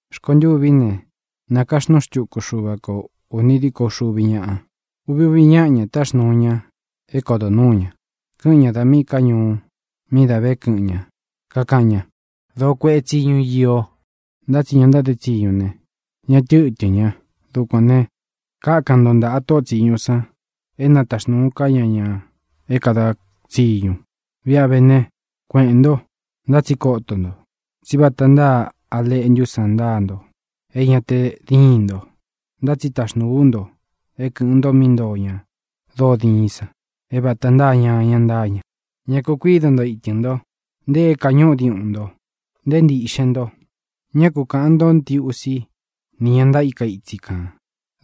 Rkontûví ne, nākaxnúu xtuku Xúva kō uni díko uxuvi ñáꞌa. Uvi úvi ñāꞌa ña táxnuu ña é kodo nuū ñá, kɨꞌɨn ña da míꞌī ká ñuú mí dā vé kɨꞌɨn ñā. Kakaꞌan ñá: —Dōó kueꞌe tsíñu iō, ntá tsi ña ntáde tsiñu ne, ñá tɨtɨ̄n ña. Dukuān ne, kákan nto ntaꞌa tóꞌo tsīñu san é na taxnūu ká ña ña é kāda tsiñu. Viꞌa ve ne, kueꞌēn nto. Ntá tsi koto nto, tsí vata ntáa a leꞌntú san ntáa nto é ñā te díin nto, ntá tsi taxnūú u nto é kɨ̄ꞌɨn nto mí ntoo ña dóo diin san, é vāta ntáa ñañā ntáa ña. Ñá kū kuído nto ītɨ́n nto, nte é kāñúꞌu diuꞌun nto, nté ntīꞌxen nto. Ñá ku kāꞌan ntó ntiusi ni ña ntaíka itsi kān.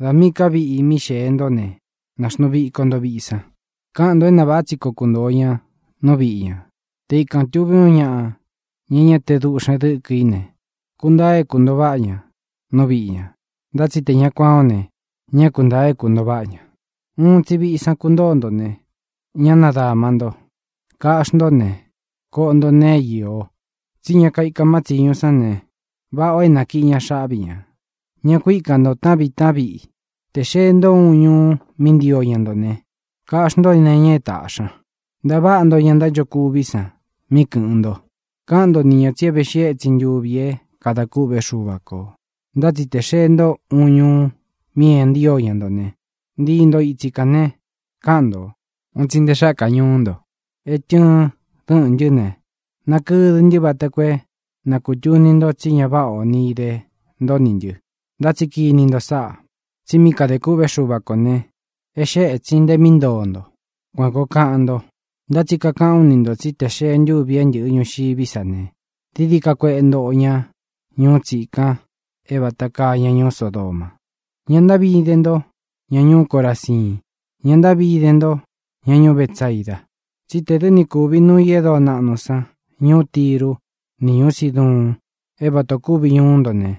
Dā míꞌī ká viꞌi mí xēe ntó ne, nāxnuu viko nto viꞌi san. Káꞌan ntō é na vāꞌá tsi koo kuntōo ña nú viꞌi ñā. Te ikān tuví uun ñaꞌa, ña é ña te dūꞌxen dɨ́kɨ í ne, kuntaa é kūntoo váꞌa ña nú viꞌi ñā. Ntá tsi tē ña kuan ó ne, ñá kuntāa é kūntoo váꞌa ña. Uun tsi viꞌi san kuntóo nto ne, ñá nadāma nto. Kaꞌxí nto ne, koꞌo nto nee é iō, tsí ña kaika má tsiñu sán ne, váꞌa ō é nakiꞌī ña xáꞌvi ñā. Ñá ku īka nto taꞌán viꞌi taꞌán viꞌi. Tē xee ntó uun ñuu mí ntio ña nto ne, kaꞌxí nto nee iña é tāꞌxi ña. Ntaváꞌa nto ña ntánchokuví san mí kɨ̄ꞌɨn nto. Káꞌan nto ni ñā tsi é veꞌxi étsin ntuvi é kadā kûꞌvé Xuva kō. Ntá tsi tē xee ntó uun ñuu mi é ña ntío ña nto ne, ntii nto itsi kān ne, káꞌan ntō: “¡Un tsi nte xákā ñuú nto é tɨɨn dɨ́ꞌɨ̄n ntɨ́ ne, nakɨdɨ ntɨ́ vata koo é na kūtuni nto tsi ñá váꞌa o ni ide nto nī ntɨ! Ntá tsi kini nto sáꞌā, tsi mí kadē kûꞌvé Xuva kō ne, é xee étsin nte mí ntoo ntō”, kuan kōo kaꞌan nto. Ntá tsi kakaꞌán u ni ntō tsí tē xee ntúvi é ntɨ̄ꞌɨ ñuxiví sa ne, dií dií ka kueꞌe ntoꞌo ña ñuú tsikan é vata kaa ña ñuú Sodoma. ʼ¡Ña ntáꞌvi ide nto, ña ñuú Coraziin! ¡Ña ntáꞌvi ide nto, ña ñuú Betsaida! tsí tē dɨ́ ni kuvi nūu í e dóo naꞌnu san ñūú Tiru ni ñuú Siduun é vata ō kúvi ñuú nto ne,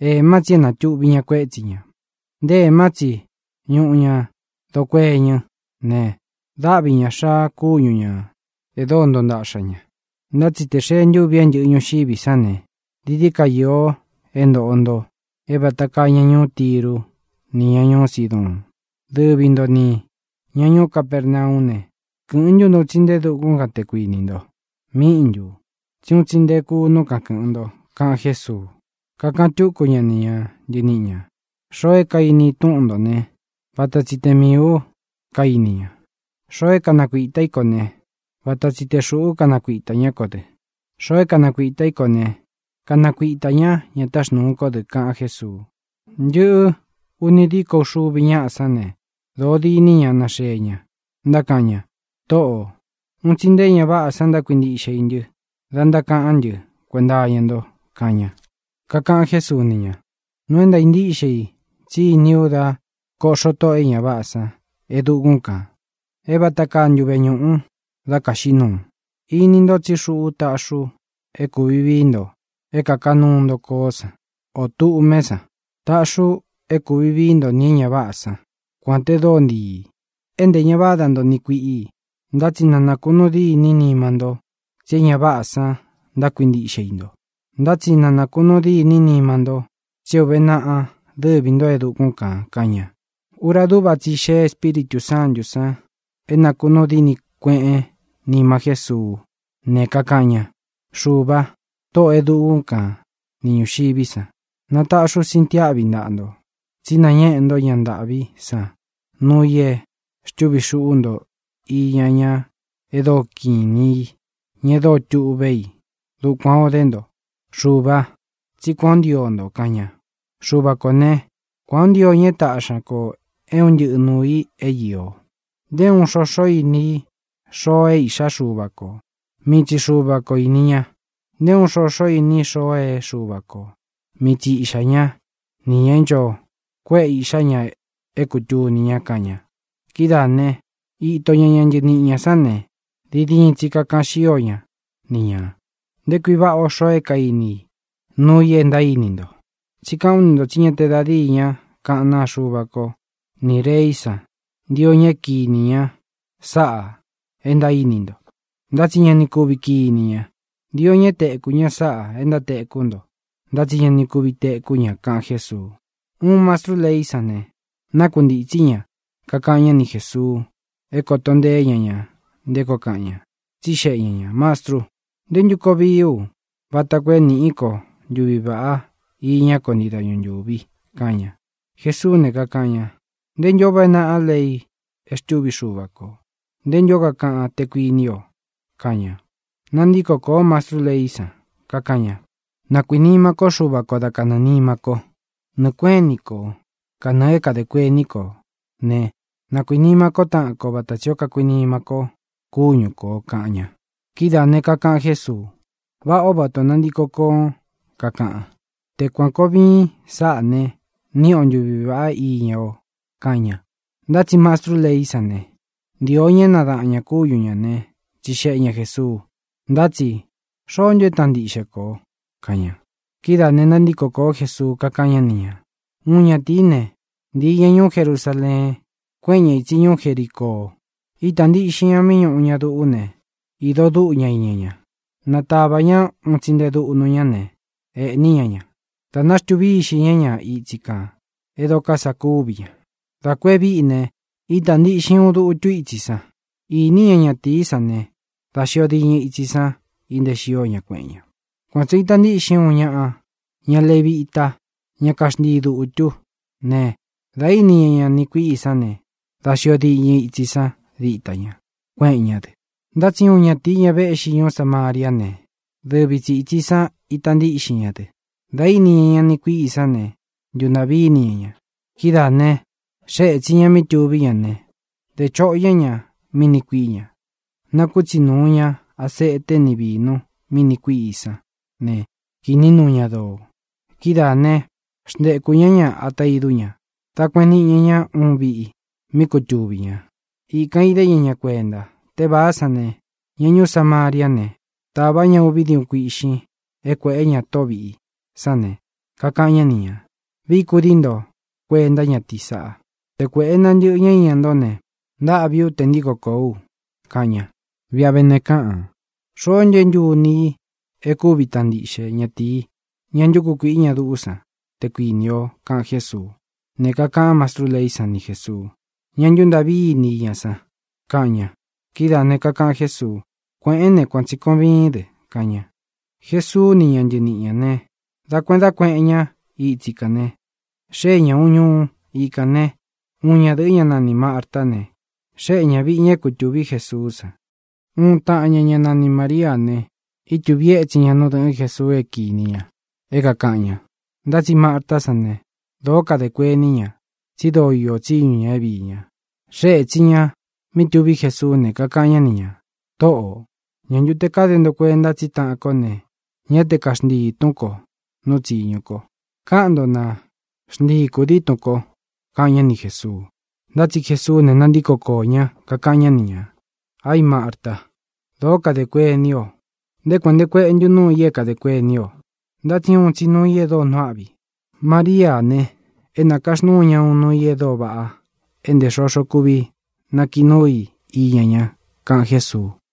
ēmá tsi e natúꞌvi ña kuétsi ñā, nté ēmá tsi ñuꞌú ña doo kueñɨ ne, dáꞌvi ña xāa kúñu ñā e dóo ntoo ntaꞌxa ña. Ntá tsi tē xee ntúvi é ntɨ̄ꞌɨ ñuxiví san ne, dií ka iō é ntoꞌo nto é vata kaa ña ñuú Tiru nī ña ñuú Siduun. Dɨvi ntō ní, ña ñuú Capernaú ne, ¿kɨ̄ꞌɨn ntú nto un tsi nte e dukún kan, te kuinī nto? ¿Míꞌi ntū? Tsí un tsi nte e kunú kan kɨ̄ꞌɨn nto —kaꞌan Jésuu. Kakaꞌan túku ña ni ña ntɨniꞌi ñā: —Xoo é kainí i túꞌun ntō ne, vata tsi te miī ú kainí ña. Xoo é kanakuītá i nto ne, vata tsi te xūꞌú kanakuitā ñá ko dɨ. Xoo é kanakuitā í ko ne, kanakuitā ñá ña táxnūu kó dɨ —kaꞌan Jésuu. Ntɨꞌɨ ūni díko uxuvi ñáꞌa sán ne, dōó diní ña náxee ña, ntákaꞌan ña: —Tōꞌó, un tsi nte é ña váꞌā san ntákuintiꞌxe i ntɨ́ da ntákaꞌán ntɨ kuenta iña nto —kaꞌan ña. Kakaꞌan Jésuu ni ña: —Nuu é ntaā ntíꞌxe i tsí iní u dá kōꞌxó tóꞌō e ña váꞌā san e dukún kān é vata kaa ntuve ñūꞌu dá kāxiꞌí nuu. Ini nto tsí xuꞌu táꞌxī u é kūvi vií nto é kāka nuú nto koó san, ō tduꞌmé san. Tāꞌxí u é kūvi vií nto nī é ña váꞌā sán, kuān te dóo ntīi, é ntē ña váda nto niꞌi kuiꞌi. Ntá tsi ña ku nakunuu dîní nima nto tsí é ña váꞌā san ntákuintiꞌxe i nto, ntá tsi na nākunuu dîní nima nto tsi é ūve naꞌa dɨ́vī ntó e dukún kān —kaꞌan ña. Ura dúꞌva tsi i xéꞌe Espíritū Sántu san é nākunuu dîni kuéꞌen nima Jésuú ne, kakaꞌan ña: —Xuva, Tōꞌó e dukún kan ni ñūxiví san, nataꞌxi ú sintiáꞌvi ntaꞌa nto, tsí nañéꞌe ntó ña ntâꞌví san nuu i é xtúvi xuꞌú nto iña ña e dóo kiꞌin inī í, ña e dóo tuꞌvé i. Dukuān ó de nto, Xuvā, tsí kuan ō ntío nto —kaꞌan ña—. ʼXuvā kó ne, kuān o ntío ña é tāꞌxi ñá ko é un ntɨꞌɨ nūu i é īo. Nté uun xoxo íni i xoo é iꞌxá Xuva kō; mii tsi Xuva ko īni ña. Nté uun xoxo íni i xoo é Xuva kō; mii tsi iꞌxā ñá, nī ña é ncho kuéꞌe īꞌxá ña é kūtuni ña —kaꞌan ña. Kidáā né, īto ña ñá ntɨniꞌi ñā sán ne, diin diin tsi kakaꞌan xío ña ni ñā: —¡Nté kui váꞌā ó xoo é kainí i nuu i é ntaíní nto! Tsí kaꞌán u ni ntō tsí ña te da díi ña kaꞌán naa Xuva ko ni rēí san ntio ña é kīní ña sáꞌā e ntaíní nto, ntá tsi ña ni kuvi kiní ña. Ntio ña é tekū ña sáꞌā e ntátekú nto, ntá tsi ña ni kuvi tekú ña —kaꞌan Jésuu. Uun mastrú leí san ne, nákuntītsí ña, kakaꞌan ñá ni Jēsuu é kōto nteé ña ña nté koo kaꞌan ña. Tsixeꞌe ña ñā: —Mastrú, ¿ntē ntú koo vií u vata koo é nīꞌí ko ntuvi vāꞌá iñá ko ntii dañu ntūvi? —kaꞌan ña. Jesuú ne, kakaꞌan ña: —¿Nte ntū ó uve naꞌa lei e xtûví Xuva kō? ¿Nte ntū ó kakaꞌan, te kuiní o? —kaꞌan ña. Nantíko kōó mastrú leí san, kakaꞌan ña: —“Na kuīnima kó Xuva ko da kanɨɨ̄ nima kó, nɨɨ kuéꞌen ini kō, kanɨɨ̄ é kadē kuení kō né, na kuīnima kó taꞌan ko vata tsī ó kakuinima míi kō kúñu kō” —kaꞌan ña. Kidáā ne, kakaꞌan Jésuu: —Váꞌā ó vata ō nantiko koón kakaꞌan. Te kuān koo viin sáꞌā ne, níꞌi o ntuvi vāꞌá iña o —kaꞌan ña. Ntá tsi mastrú leí san ne, ntīo ña é nadaꞌan ñā kúñu ñā né, tsixeꞌe ña Jēsuu: —Ntá tsi ¿xoó ntu é taꞌan ntiꞌxe i ko? —kaꞌan ña. Kidáā ne, nantíko kōó Jesuu, kakáꞌan ñá ni ñā: —Uun ñatīí ne, ntīi ña ñuú Jerusaleen, kuéꞌen ña ītsi ñuú Jericoo. Ítā ntiꞌxin ña mí ñūꞌu ña duꞌú ne, īdo dúꞌu ña iña ña. Nātavá ña un tsi nte dúꞌnu ñá ne, ēꞌní ña ña. Dā náxtūvi íxī ñá ña itsi kān e dóko sā kúvi ña. Dā ku e víꞌi ne, ítā ntiꞌxin uun dutu ítsi san. Īní ña ñatīí san ne, dá xio diñɨ itsi san inteé xio ña, kueꞌen ña. Kuan tsī o ita ntíꞌxin uun ñaꞌa ña levita, ñá kaxntii dūtú ne, dā íni ña ña niꞌi kuiꞌí i san ne, dá xio diñɨ itsi san díta ña, kuéꞌen ñá dɨ. Ntá tsi uun ñatīí, ña véꞌxi ñuú Samariá ne, dɨvi tsi itsī san ítā ntiꞌxin ña dɨ. Dā íni ña ña niꞌi kuiꞌí i sán ne, ntuntāꞌví ini ña ña. Kidáā ne, xée ētsin ña mí tuví ña ne, dé choꞌo ñá ña mí niꞌi kuiꞌí ña. Nakútsi nūu ña asete ni vínu mí niꞌi kuīꞌí san ne, kīꞌní nuu ña doo. Kidáā né, xntekū ñá ña ata idú ña, dā kueꞌen niꞌi ña ña uun viꞌi mí kutuvī ña. Ikan īdé ña ña kuenta. Tévāá san ne, ña ñuú Samariá ne, tāvá ña uví diuꞌún kuīꞌxin é kuēꞌé ña tóꞌo vīꞌi sán ne, kakaꞌan ñá ni ñā: “Vií kudii nto kuenta ñátīí saꞌa. Te kuēꞌe nantɨꞌɨ ñá iña ntó ne, ntaꞌvi ú tē ntíko kōó u”, kaꞌan ña. Viꞌi a vé ne, káꞌān: ¿Xoó ntu é ntuni i e kúvi taꞌan ntiꞌxe ñatīí, ña ntúku kuīꞌi ña duꞌú san, te kuinī o? —kaꞌan Jésuu. Ne, kakaꞌan mástrú leí san ni Jēsuu: —Ña ntúntaꞌví ini i ña san —kaꞌan ña. Kidáā ne, kakaꞌan Jésuu: —Kuēꞌén ne, kuan tsi kōo viín dɨ —kaꞌan ña. Jesuu ni ña ntɨníꞌi ñā ne, da kueꞌen dá kueꞌen ña itsi kān ne, xée ña ūun ñuu. Ikān né, uun ñadɨ̄ꞌɨ́, ñá nanī Martá ne, xéꞌe ña vīꞌi ña é kutūví Jesuú san. Uun taꞌan ña, ñá nani Māriá ne, ítūví etsin ña nú dɨ̄ꞌɨ́n Jesuu é kīni ña é kākaꞌan ña. Ntá tsi Martá san ne, dōó kadē kuení ña, tsi dóo iō tsíñu ñā é viī ña. Xée ētsin ña mí tuví Jesuú ne, kakaꞌan ñá ni ñā: —Tōꞌó, ¿ñā ntu te káde nto kuenta tsí taꞌan kó ne, ñá te kaxnchíi tún ko nu tsiñu ko? Káꞌan nto, na xnchii kūdií tun ko —kaꞌan ñá ni Jēsuu. Ntá tsi Jesuú ne, nantíko koō ñá, kakaꞌan ñá ni ñā: —¡Aí, Marta! Dōó kadē kuení o. ¿Nté kuān nte kueꞌe ntu núu i é kadē kuení o? Ntá tsi uun tsi nuu i e dóo nuu áꞌvi. Mariá ne, é nakaxnúu ña uun nuu i e dóo váꞌa é ntē xoxo kuvi nakiꞌi núu i iña ña —kaꞌan Jésuu.